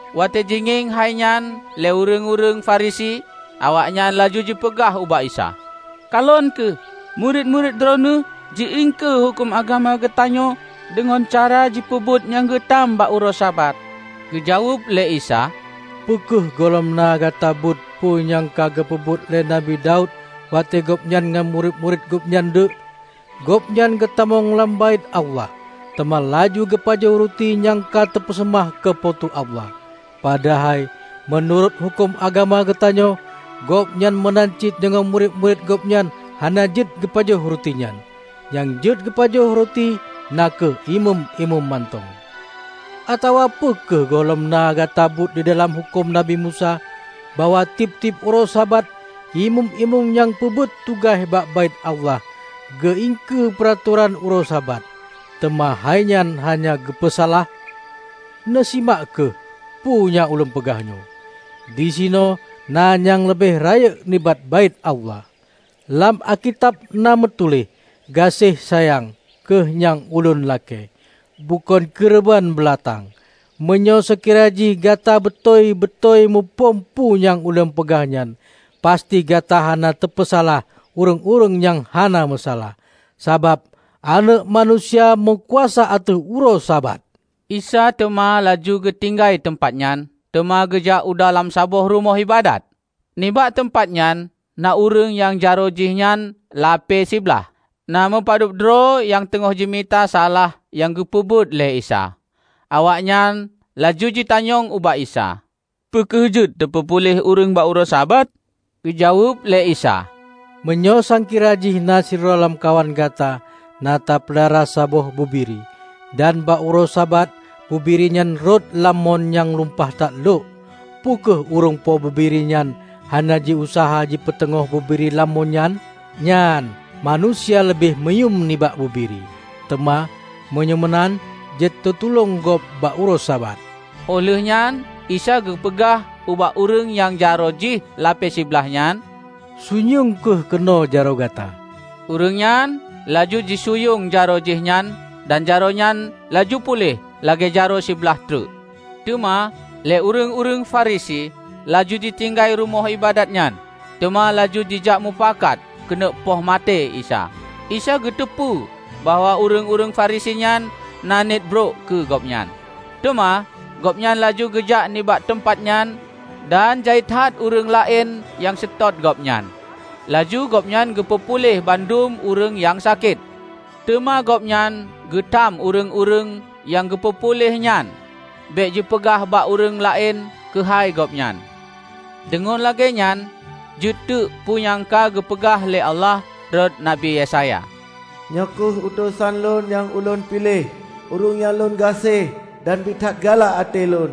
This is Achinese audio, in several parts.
Watée jingieng hai nyan lé ureuëng-ureuëng Farisi, awaknyan laju jipeugah ubak Isa, "Kalon kheueh! Murit-murit Droeneueh ji-iengkeue huköm agama geutanyoe deungon cara jipeubuet nyang geutham bak uroe Sabat." Geujaweueb lé Isa, "Peu kheueh gohlom na gata beuet peue nyang ka geupeubuet lé Nabi Daud watée gobnyan ngon murit-murit gobnyan deuek? Gobnyan geutamong lam Baét Allah; teuma laju geupajoh ruti nyang ka teupeuseumah keu Po teu Allah. Padahai meunurot huköm agama geutanyoe, gobnyan meunan cit deungon murit-murit gobnyan hana jeuet geupajoh ruti nyan -- nyang jeuet pajoh na kheueh imeum-imeum mantong. Atawa peu kheueh gohlom na gata beuet didalam huköm Nabi Musa bahwa tieb-tieb uroe Sabat imeum-imeum nyang peubuet tugaih bak Baét Allah, geu-iengkeue peuratoran uroe Sabat, teuma hainyan hana geupeusalah? Neusimak kheueh peue nyang Ulôn peugah nyoe: disinoe na nyang leubeh rayeuk nibak Baét Allah. Lam Alkitab na meutuléh: Gaséh sayang kheueh nyang Ulôn lakée, bukon keureubeuen beulatang. Meunyoe seukira jih gata beutôi-beutôi muphom peue nyang Ulôn peugah nyan, pasti gata hana tapeusalah ureuëng-ureuëng nyang hana meusalah. Sabab Aneuëk Manusia meukuasa ateueh uroe Sabat." Isa teuma laju geutinggai teumpat nyan teuma geujak u dalam saboh rumoh iébadat. Nibak teumpat nyan na ureuëng nyang jaroe jihnyan lapée siblaih. Na meupadub droe nyang teungoh jimita salah nyang geupeubuet lé Isa, awaknyan laju jitanyong ubak Isa, "Peu kheueh jeuet teupeupuléh ureuëng bak uroe Sabat?" Geujaweueb lé Isa, "Meunyoe sangkira jih na sidroe lamkawan gata na tapeulara saboh bubiri, dan bak uroe Sabat bubiri nyan rhot lam mon nyang lumpah that lhok; peu kheueh ureuëng po bubiri nyan hana jiuseuha jipeuteungoh bubiri lam mon nyan? Nyan, manusia leubeh muyuem nibak bubiri! Teuma, meunyoe meunan, jeuet teutulông gob bak uroe Sabat." Óh lheueh nyan Isa geupeugah ubak ureuëng nyang jaroe jih lapée siblaih nyan, "Sunyueng kheueh keunoe jaroe gata." Ureuëng nyan laju jisunyueng jaroe jihnyan, dan jaroe nyan laju puléh lagée jaroe siblaih treuk. Teuma lé ureuëng-ureuëng Farisi laju jitinggai rumoh iébadat nyan, teuma laju jijakmupakat keuneuk poh maté Isa. Isa geuteupeue bahwa ureuëng-ureuëng Farisi nyan na niet brok keu Gobnyan. Teuma, Gobnyan laju geujak nibak teumpat nyan dan jai that ureuëng laén nyang seutôt Gobnyan. Laju Gobnyan geupeu puléh bandum ureuëng nyang sakét. Teuma Gobnyan geutham ureuëng-ureuëng nyang geupeu puléh nyan bék jipeugah bak ureuëng laén keuhai Gobnyan. Deungon lagée nyan jeuet teuk peue nyang ka geupeugah lé Allah rot Nabi Yesaya, "Nyoe kheueh utosan lôn nyang ulôn piléh, Ureuëng nyang Lôn gaséh dan biet that galak até Lôn.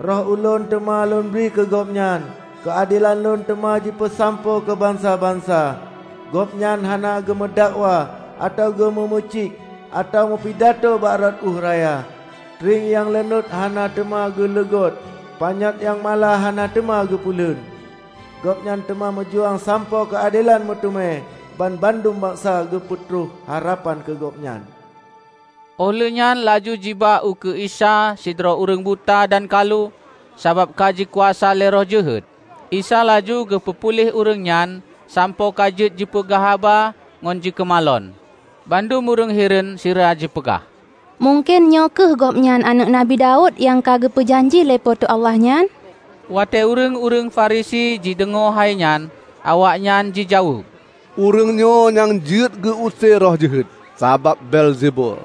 Roh Ulôn teuma Lôn bri keu Gobnyan, keuadelan Lôn teuma jipeusampoe keu bansa-bansa. Gobnyan hana geumeudakwa atawa geu-geumeuciek, atawa meupidato bak rot ueh raya. Trieng nyang leunuet hana teuma geuleugôt panyöt nyang mala hana teuma geupeulon. Gobnyan teuma meujuang sampoe keuadelan meuteumé; banmandum bansa geupeutroh harapan keu Gobnyan." Óh lheueh nyan laju jiba ukeue Isa sidroe ureuëng buta dan kalu sabab ka jikuasa lé roh jeuhet. Isa laju geupeu puléh ureuëng nyan sampoe ka jeuet jipeugah haba ngon jikeumalon. Bandum ureuëng hireuen sira jipeugah, "Mungken nyoe kheueh Gobnyan Aneuëk Nabi Daud nyang ka geupeu janji lé Po teu Allah nyan?" Watée ureuëng-ureuëng Farisi jideungoe hai nyan, awaknyan jijaweueb, "Ureuëng nyoe nyang jeuet geu-use roh jeuhet, sabab Beelzebul,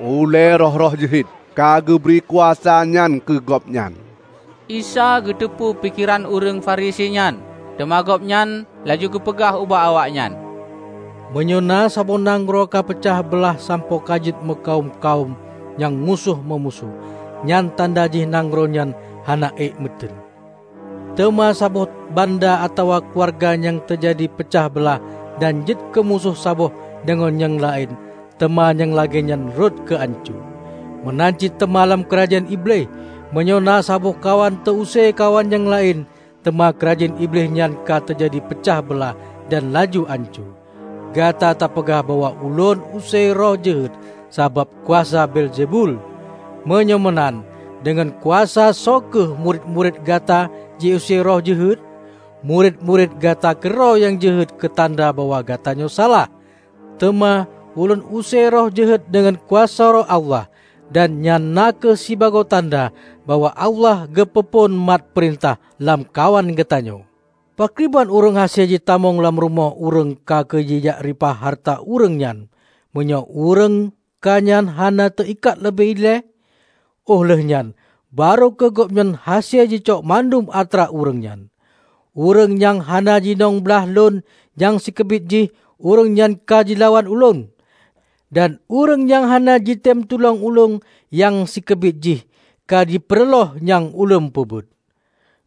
ulée roh-roh jeuhet, ka geubri kuasa nyan keu Gobnyan." Isa geuteupeue pikeran ureuëng Farisi nyan. Teuma Gobnyan laju geupeugah ubak awaknyan, "Meunyoe na saboh nanggroe ka peucah beulah sampoe ka jeuet meukawöm-kawöm nyang musoh meumusoh, nyan tanda jih nanggroe nyan hana ék meuteuen. Teuma saboh banda atawa keuluwarga nyang teujadi peucah beulah dan jeuet keumusoh saboh deungon nyang laén teuma nyang lagée nyan rhot keu ancoe. Meunan cit teuma lam keurajeuen Iblih; meunyoe na saboh kawan teu-use kawan nyang laén, teuma keurajeuen Iblih nyan ka teujadi peucah beulah dan laju ancoe. Gata tapeugah bahwa Ulôn use roh jeuhet sabab kuasa Beelzebul. Meunyoe meunan deungon kuasa soe kheueh murit-murit gata jiuse roh jeuhet. Murit-murit gata keudroe nyang jeuet keutanda bahwa gatanyoe salah! Teuma Ulôn use roh jeuhet deungon kuasa Roh Allah. Dan nyan na kheueh sibagoe tanda bahwa Allah ka geupeu phon mat peurintah lamkawan geutanyoe. Pakriban ureuëng hase jitamong lam rumoh ureuëng kha keu jijak reupah hareuta ureuëng nyan, meunyoe ureuëng kha nyan hana teu-ikat leubeh ilée? Óh lheueh nyan, barô kheueh gobnyan hase jicok bandum atra ureuëng nyan. Ureuëng nyang hana jidong blaih Lôn nyang sikeubiet jih ureuëng nyan ka jilawan Ulôn. Dan ureuëng nyang hana jitem tulông Ulôn nyang sikeubiet jih ka jipeureulôh nyang Ulôn peubuet!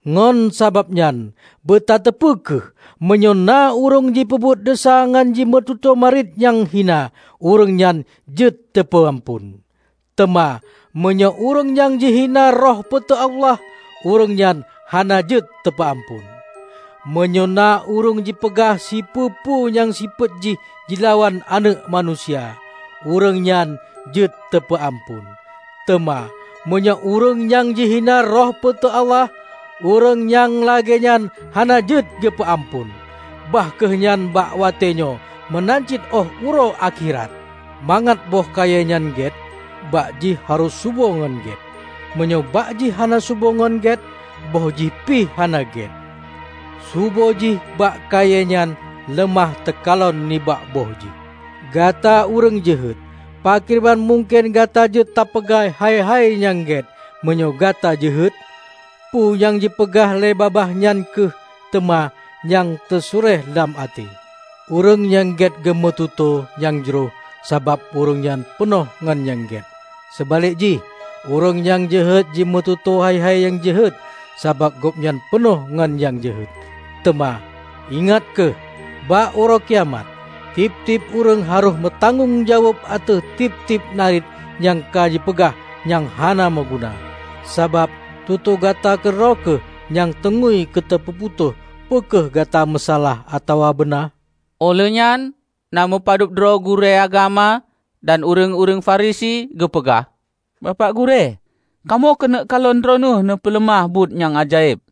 Ngon sabab nyan, beutateupeu kheueh, meunyoe na ureuëng jipeubuet desya ngon jimeututoe nariet nyang hina, ureuëng nyan jeuet teupeu amphon! Teuma meunyoe ureuëng nyang jihina Roh Po teu Allah, ureuëng nyan hana jeuet teupeu amphon! Meunyoe na ureuëng jipeugah sipeue-peue nyang sifeuet jih jilawan Aneuëk Manusia, ureuëng nyan jeuet teupeue amphon, teuma meunyoe ureuëng nyan jihina Roh Po teu Allah, ureuëng nyang lagée nyan hana jeuet geupeu amphon, bah kheueh nyan bak watée nyoe meunan cit óh uroe akhirat!" "Mangat boh kayée nyan gét, bak jih harôh subo ngon gét. Meunyoe bak jih hana subo ngon gét, bôh jih pih hana gét. Subö jih bak kayée nyan leumah teukalon nibak bôh jih. Gata ureuëng jeuhet, pakriban mungken gata jeuet tapeugah hai-hai nyang gét meunyoe gata jeuhet? Peue nyang jipeugah lé babah nyan kheueh teuma nyang teusuréh dalam até! Ureuëng nyang gét geumeututoe nyang jroh sabab ureuëng nyan peunoh ngon nyang gét. Seubalek jih, ureuëng nyang jeuhet jimeututoe hai-hai nyang jeuhet sabab gobnyan peunoh ngon nyang jeuhet. Teuma, ingat kheueh: bak Uroe Kiamat, tieb-tieb ureuëng harôh meutanggong jaweueb ateueh tieb-tieb nariet nyang ka jipeugah nyang hana meuguna. Sabab tutoe gata keudroe kheueh nyang teungui keu teupeuputôh peu kheueh gata meusalah atawa beuna." Óh lheueh nyan na meupadub droe gurée agama dan ureuëng-ureuëng Farisi geupeugah, "Bapak gurée, kamoe keuneuk kalon Droeneueh neupeuleumah buet nyang ajaéb."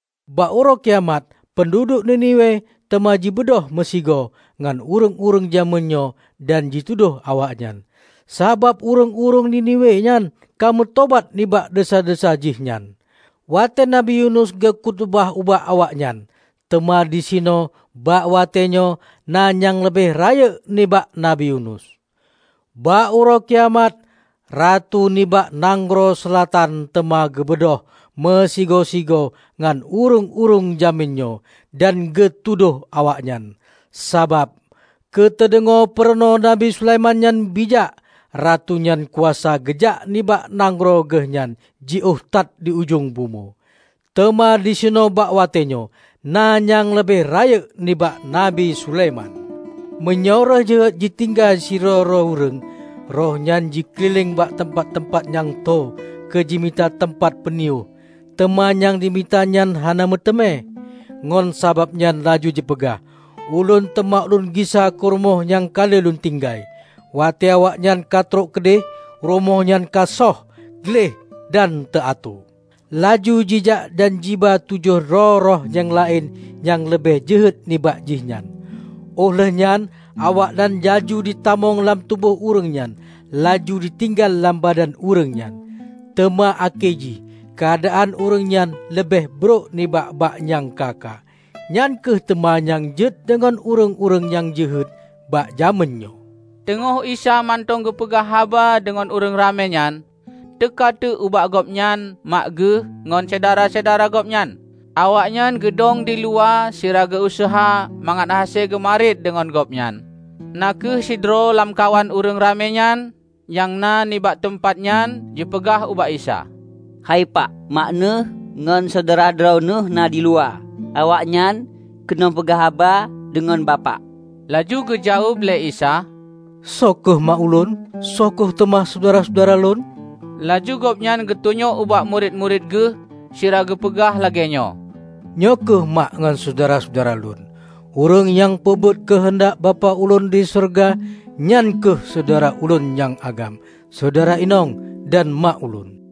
Bak Uroe Kiamat, peunduduek Niniwe teuma jibeudôh meusigoe ngon ureuëng-ureuëng jamén nyoe dan jitudôh awaknyan. Sabab ureuëng-ureuëng Niniwe nyan ka meutobat nibak desya-desya jih nyan, watée Nabi Yunus geu-khutubah ubak awaknyan. Teuma disinoe bak watée nyoe na nyang leubeh rayeuk nibak Nabi Yunus! Bak Uroe Kiamat, ratu nibak nanggroe Seulatan teuma geubeudôh meusigoe-sigoe ngon ureuëng-ureuëng jamén nyoe dan geutudôh awaknyan. Sabab keu teudeungoe peurunoe Nabi Sulaiman nyan bijak, ratu nyan kuasa geujak nibak nanggroe geuh nyang jiôh that di ujong bumoe. Teuma disinoe bak watée nyoe na nyang leubeh rayeuk nibak Nabi Sulaiman!" "Meunyoe roh jeuhet jitinggai sidroe-droe ureuëng, roh nyan jikeulileng bak teumpat-teumpat nyang tho keu jimita teumpat peuniyôh, teuma nyang jimita nyan hana meuteumé. Ngon sabab nyan laju jipeugah, 'ulôn teuma lôn gisa u rumoh nyang ka lôn tinggai.' Watée awaknyan ka trok keudeh, rumoh nyan ka shoh, gleh dan teu-atoe. Laju jijak dan jiba tujoh droe roh nyang laén nyang leubeh jeuhet nibak jih nyan. Óh lheueh nyan awaknyan laju jitamong lam tuboh ureuëng nyan, laju jitinggai lam badan ureuëng nyan. Teuma akhé jih keuadaan ureuëng nyan leubeh brok nibak bak nyang ka-ka. Nyan kheueh teuma nyang jeuet deungon ureuëng-ureuëng jeuhet bak jamén nyoe." Teungoh Isa mantong geupeugah haba deungon ureuëng ramé nyan, teuka teuk ubak Gobnyan mak Geuh ngon syedara-syedara Gobnyan. Awaknyan geudong diluwa sira geu-useuha mangat hase geumariet deungon Gobnyan. Na kheueh sidroe lamkawan ureuëng ramé nyan, nyang na nibak teumpat nyan jipeugah ubak Isa, "Hai pak, mak neueh ngon syedara droeneueh na di luwa. Awaknyan keuneuk peugah haba deungon Bapak." Laju geujaweueb lé Isa, "Soe kheueh mak Ulôn? Soe kheueh teuma syedara-syedara Lôn?" Laju Gobnyan geutunyok ubak murit-murit Geuh sira geupeugah lagée nyoe, "Nyoe kheueh mak ngon syedara-syedara Lôn. Ureuëng nyang peubuet keuheundak Bapak Ulôn di syeuruga, nyan kheueh syedara Ulôn nyang agam, syedara inong, dan mak Ulôn."